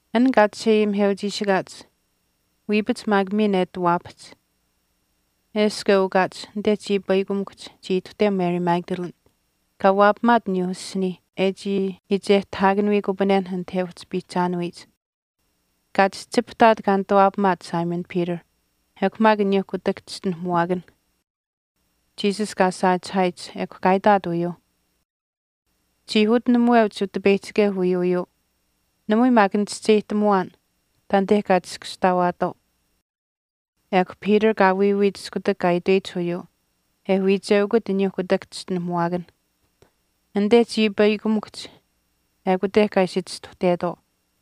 An kaa chisheayimiheuchiishikaach wiipach maak miin e ati waapahch, eshkw e ukaach anite chiipaikamikuhch chii ituhteu Mary Magdalene kaa waapamaat aniyuu asiniih e chii iichehtahaakanuyikupanen anit e uhchi piihchaanuyich. Kaa chihchipahtaat kaa nituwaapamaat Simon Peter ekw maak aniyuu kutak chischinuhamuwaakan Jesus kaa saachihaayich ekw kaa itaat uyuuh, “Chii utinamuweuch Utipeyihchikeu wiiyuuyuu namui maak nichischeyihtamuwaan taanite kaa chiskashtaawaatwaau.” Ekw Peter kaa wiiwiit iskutak kaa itweyich uyuu e wiicheukut aniyuu kutak chischinuhamuwaakan. Anite chiipaikamikuhch ekute kaa ishi chistuhtetwaau.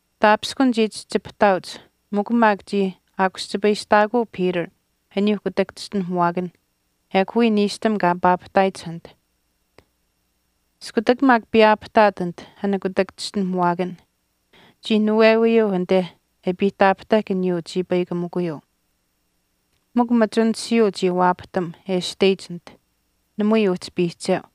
Taapishkun chii chihchipahtaauch mikw maak chii aakuschipayistaakuu Peter aniyuu kutak chischinuhamuwaakan ekw wiya niishtam kaa paapahtaayich anit. Iskutak maak piyaapahtaat anite an kutak chischinuhamuwaakan chii nuwewiyuu anite e piihtaapahtahk aniyuu chiipaikamikuyuu. Mikw machunishiyuu chii waapatam e ashteyich anite. Namui uhchi piihcheu.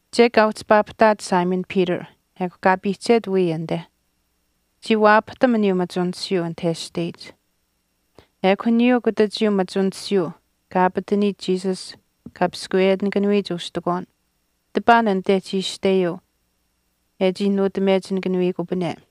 Chek kaa uhchi paapahtaat Simon Peter ekw kaa piihchet wiya anite. Chii waapahtam aniyuu machunishiyuu anit e ashteyich. Ekw aniyuu kutachiyuu machunishiyuu kaa aapataniyich Jesus kaa piskweyetinikanuyich ustikwaan tipaan anite chii ashteyuu e chii nuutamechinikanuyikupane.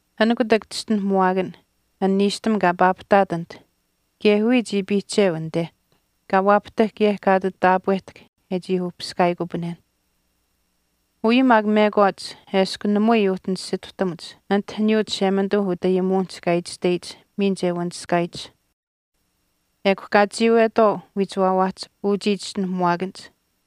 An kutak chischinuhamuwaakan, an niishtam kaa paapahtaat anit, kaye wiya chii piihcheu anite, kaa waapahtahk kaye kaa ati taapwehtahk e chii uhpiskaayikupanen. Uyuu maak mekwaach eshkw namui uhchi nisituhtamuch anit aniyuu Chishemanituu utayimuwinihch kaa itashteyich miin che wanishkaayich. Ekw kaa chiiwetwaau wiichiwaawaahch uchii chischinuhamuwaakanich.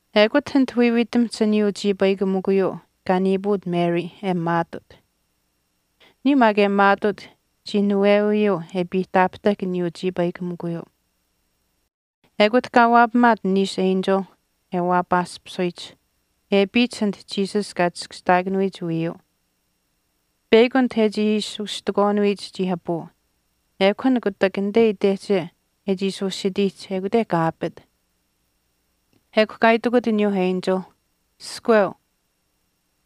Ekut anit wiiwiitamihch aniyuu chiipaikamikuyuu kaa niipuut Mary e maatut. Aniyuu maak e maatuut chii nuwewiyuu e piihtaapahtahk aniyuu chiipaikamikuyuu. Ekut kaa waapamaat niishu enchil e waapaaspisuyich e apiyich anit Jesus kaa chiskashtaakanuyich wiiyuu. Peyakw anite e chii ishi ustikwaanuyich chii apuu ekw an kutak anite itehche e chii ishi usitiihch ekute kaa apit. Ekw kaa itikut aniyuu enchil, “Iskweu,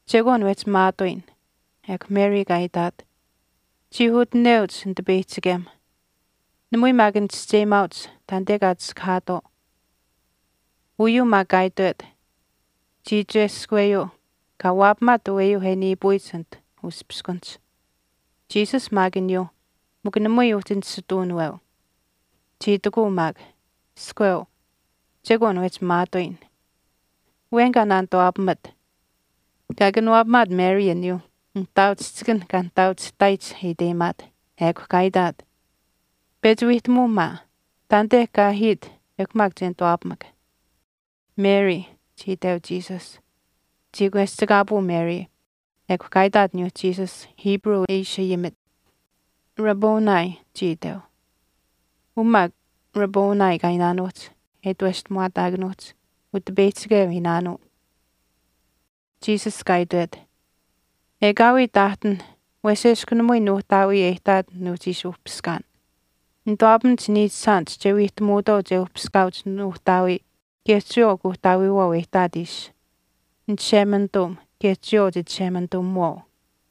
Chekwaan wehchi maatuuyin.” Ekw Mary kaa itaat, “Chii utineuch Nitipeyihchikem namui maak nichischeyimaauch taanite kaa chiskahaatwaau.” Uyuu maak kaa itwet chii iicheskweyuu kaa waapamaat aweyuu e niipuyich anite uspiskunihch, Jesus maak aniyuu mikw namui uhchi nisituunaweu. Chii itikuu maak, “Iskweu, chekwaan wehchi maatuuyin. Awen kaa nanituwaapamat.” Kaa kanawaapamaat Mary aniyuu nihtaauchihchikanh kaa naanaakachihtaayich e iteyimaat, ekw kaa itaat, “Pechi wiihtamuu maa taanite kaa ahiit ekw maak che nituwaapamak.” “Mary,” chii iteu Jesus. Chii kweschikaapuu Mary ekw kaa itaat aniyuu Jesus Hebrew e ishi ayimit, “Rabboni,” chii iteu. Uu maak Rabboni kaa iinaanuuhch e itweshtamuwaataakanuuhch Utipeyihchikeu iinaanuu. Jesus kaa itwet, “Ekaawii taahtin wesh eshkw namui Nuuhtaawii e ihtaat nuuhchii ishi uhpiskaan. Nituwaapamach niichishaanich che wiihtamuutwaau che uhpiskaauch Nuuhtaawii kaye chiyawaau Kuuhtaawiiwaau e ihtaat ishi, Nichishemanituum kaye chiyawaau Chichishemanituumiwaau.”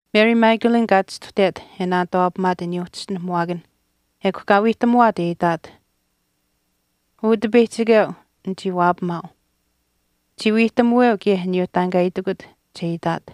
Mary Magdalene kaa chistuhtet e naanituwaapamaat aniyuu chischinuhamuwaakan ekw kaa wiihtamuwaat e itaat, Utipeyihchikeu nichii waapamaau. Chii wiihtamuweu kaye aniyuu taan kaa itikut che itaat.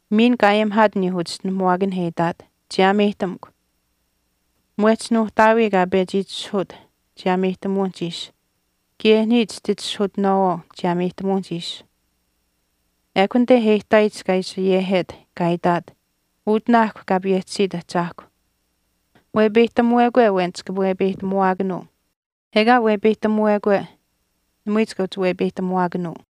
Miin kaa ayimihaat aniyuu uchischinuhamuwaakanh e itaat, “Chiyaameyihtamukw. Mwehch Nuuhtaawii kaa pechi itishahuut chiyaameyihtamuwinihch ishi kaye niya chititishahutinaawaau chiyaameyihtamuwinihch ishi.” Ekw anite e ihtaayich kaa ishi ayehet kaa itaat, “Utinaahkw Kaa payehchisit Ahchaahkw. Wepeyihtamuwekwe awen chika wepeyihtamuwaakanuu, ekaa wepeyihtamuwekwe namui chika uhchi wepeyihtamuwaakanuu.”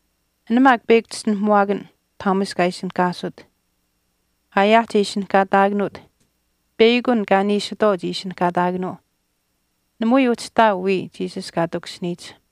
An maak peyakw chischinuhamuwaakan Thomas kaa ishinihkaasut aayaahch e ishinihkaataakanuut peyakw an kaa niishitwaau chii ishinihkaataakanuu, namui uhchi ihtaau wiya Jesus kaa takushiniyich.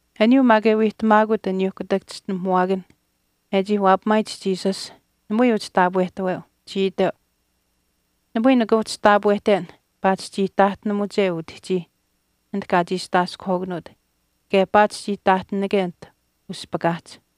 Aniyuu maak e wiihtamaakut aniyuuh kutak chischinuhamuwaakanh e chii waapamaayich Jesus, namui uhchi taapwehtaweu. Chii iteu, “Namui nika uhchi taapwehten paatish chii taahtinamuche utihchiih anit kaa chiistaaskuhwaakanuut kaye paatish chii taahtinake anit uspakaahch.”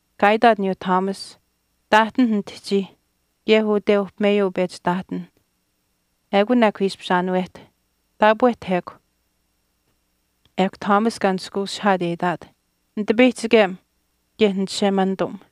Kaa itaat aniyuu Thomas, “Taahtinh nitihchii kaye ute uhpimeyuu pechi taahtinh, ekun ekw ishpish aanuwehta, taapwehta ekw.” Ekw Thomas kaa nishkweushihaat e itaat, “Nitipeyihchikem kaye Nichishemanituum.”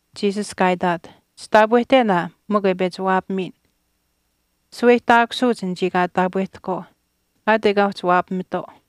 Jesus kaa itaat, “Chitaapwehten aa mikw e pechi waapamiin. Shaweyihtaakusuuch anichii kaa taapwehtahkwaau aat ekaa uhchi waapamitwaau.”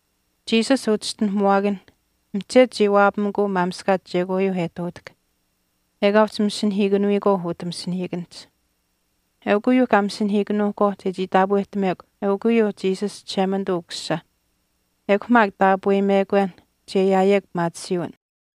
Jesus uchischinuhamuwaakan mihchetu chii waapamikuu maamishkaach chekwaayuu e ihtuutahk ekaa uhchi masinahiikanuyikwaau utah masinahiikanihch. Eukw uyuuh kaa masinahiikanuukwaau chechii taapwehtamekw eukw uyuuh Jesus Chishemanituu Ukusisa ekw maak taapweyimekwen che ayaayekw pimaatisiiwin.